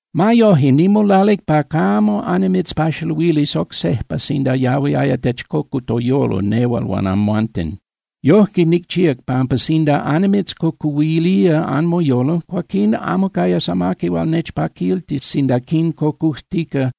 Ma yoje, nimolalic pa camo annimitzpaxaluilis oc sejpa sinda yahuiaya techcocu toyolo nehual huan amhuanten. Yojque nicchíac pampa sinda annimitzcocuhuilía anmoyolo, cuaquín amo cayas amaqui hual nechpaquiltis sinda quincocujtica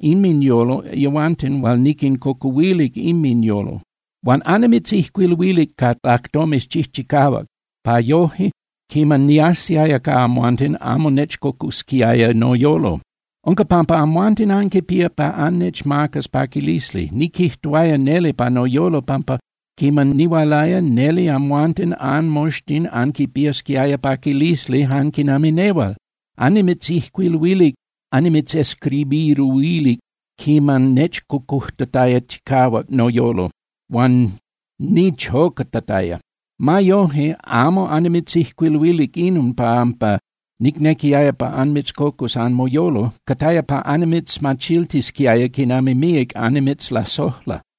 inminyolo yehuanten hual niquincocuhuilic inminyolo. Huan annimitzijcuiluilic ca lajtomes chijchicahuac pa yoje, quiman niajsiaya ca amhuanten, amo nechcocusquiaya noyolo. Unca pampa amhuanten anquipía pa annechmacas paquilisli. Niquijtuaya neli pa noyolo pampa quiman nihualaya, neli amhuanten anmoxtin anquipiasquiaya paquilisli jan quinami nehual. Annimitzijcuiluilic (annimitzescribiruilic) quiman nechcocujtataya chicahuac noyolo, huan nichocatataya. Ma yoje, amo annimitzijcuiluilic inon pampa nicnequiaya pa anmitzcocus anmoyolo. Cataya pa annimitzmachiltisquiaya quinami míac annimitzlasojla.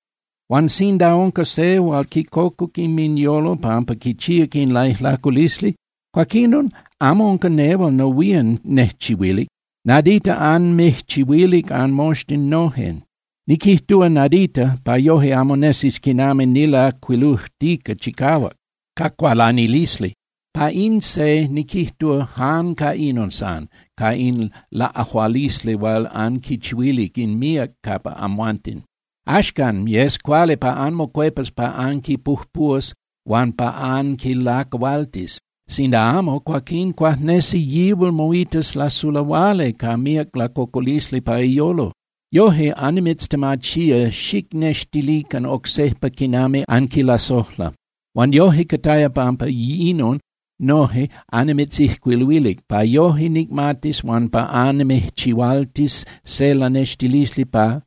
Huan sinda unca se hual quincocuc inminyolo pampa quichíac in laijlaculisli, cuaquinon amo unca nehual nohuían nejchihuilic. Nadita anmijchihuilic anmoxtin noje. Niquijtúa “nadita” pa yoje amo nesis quinami nilajcuilujtica chicahuac ca cualanilisli. Pa in se niquijtúa “jan ca inon san” ca in laꞌajualisli hual anquichihuilic in míac capa amhuanten. Axcan, yes cuali pa anmocuepas pa anquipujpúas huan pa anquilacahualtis. Sinda amo, cuaquín cuajnesi yihual moitas lasulahuali ca míac lacocolisli pa iyolo. Yoje, annimitztemachía xicnextilican oc sejpa quinami anquilasojla. Huan yoje, cataya pampa inon noje annimitzijcuiluilic, pa yoje nicmatis huan pa annimijchihualtis se lanextilisli pa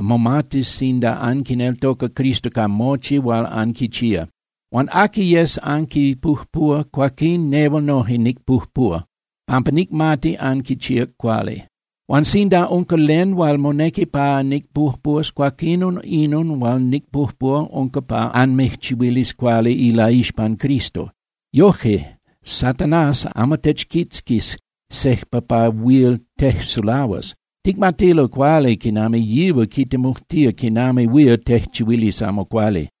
momatis sinda anquineltoca Cristo ca mochi hual anquichía. Huan aqui yes anquipujpúa, cuaquín nehual noje nicpujpúa pampa nicmati anquichíac cuali. Huan sinda unca len hual monequi pa nicpujpúas, cuaquinon inon hual nicpujpúa unca pa anmijchihuilis cuali ilaixpan Cristo. Yoje Satanás amo techquitzquis sejpa pa huil tejsulahuas. Ticmatilo cuali quinami yihual quitemujtía quinami huil tejchihuilis amo cuali.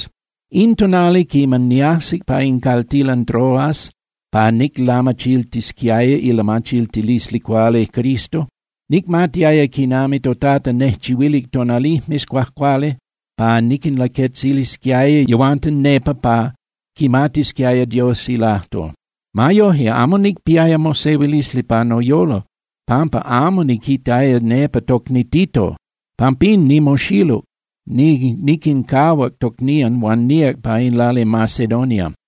In tonali quiman niajsic pa in caltilan Troas pa niclamachiltisquiaya ilamachiltilisli cuali Cristo, nicmatiaya quinami toTata nejchihuilic tonalijmes cuajcuali pa niquinlaquetzilisquiaya yehuanten nepa pa quimatisquiaya Dios ilajtol. Ma yoje, amo nicpiaya mosehuilisli pa noyolo pampa amo niquitaya nepa tocni Tito. Pampín nimoxiluc, niquincahuac tocnían huan níac pa in lali Macedonia.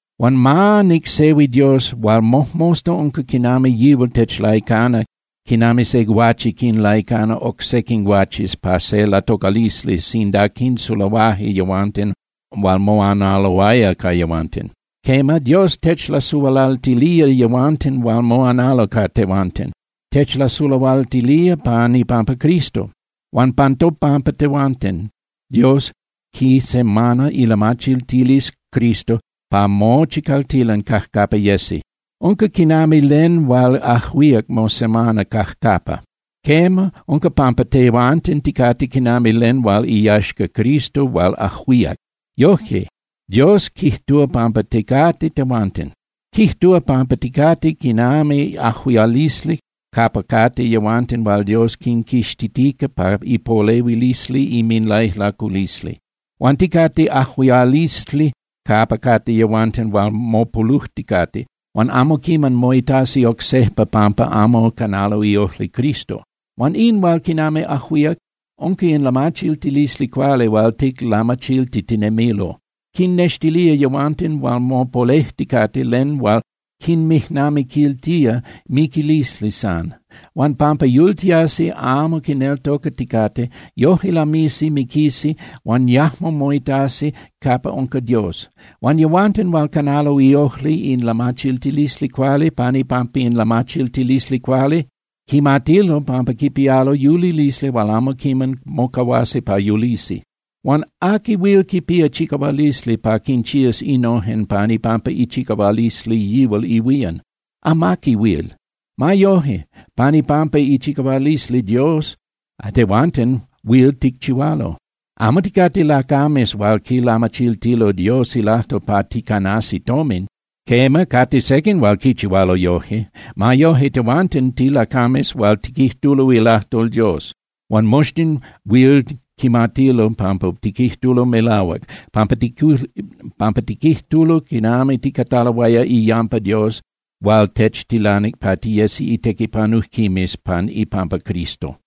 Huan ma nicsehui Dios hual mojmosta unca quinami yihual techlaicana quinami se guache quinlaicana oc sequin guaches pa se latocalisli sinda quinsulahuaje yehuanten hual moanaloaya ca yehuanten. Quema, Dios techlasulahualtilía yehuanten hual moanalo ca tehuanten, techlasulahualtilía pan ipampa Cristo. Huan pan topampa tehuanten, Dios quisemana ilamachiltilisli Cristo pa mochi caltilan cajcapa yesi. Unca quinami len hual ajuíac mosemana cajcapa. Quema, unca pampa tehuanten ticate quinami len hual iyaxca Cristo hual ajuíac. Yojque Dios quijtúa pampa ticate tehuanten. Quijtúa pampa ticate quinami ajuialisli capa cate yehuanten hual Dios quinquixtitica pa ipolehuilisli inminlaijlaculisli. Huan ticate ajuialisli capa cate yehuanten hual mopolujticate huan amo quiman moitasi oc sejpa pampa amo canalo iojli Cristo. Huan in hual quinami ajuíac, unca in lamachiltilisli cuali hual ticlamachiltitinemilo. Quinnextilía yehuanten hual mopolejticate len hual quinmijnamiquiltía miquilisli san. Huan pampa yultiasi amo quineltocaticate, yoje lamisi miquisi huan yajmo moitasi capa unca Dios. Huan yehuanten hual canalo iojli in lamachiltilisli cuali, pan ipampa in lamachiltilisli cuali, quimatilo pampa quipialo yulilisli huan amo mocahuasi pa yulisi. Huan ¿aqui huil quipía chicahualisli pa quinchías innojen pan ipampa ichicahualisli yihual ihuían? Amaqui huil. Ma yoje, pan ipampa ichicahualisli Dios tehuanten huil ticchihualo. Amo ticate lacames hual quilamachiltilo Dios ilajtol pa ticanasi tomin. Quema, cate sequin hual quichihualo yoje. Ma yoje, tehuanten tilacames hual tiquijtulo ilajtol Dios. Huan moxtin huil quimatilo pampa tiquijtulo melahuac, pampa tiquijtulo quinami ticataloaya iyampa Dios hual techtilanic pa tiyesi itequipanujquimes pan ipampa Cristo.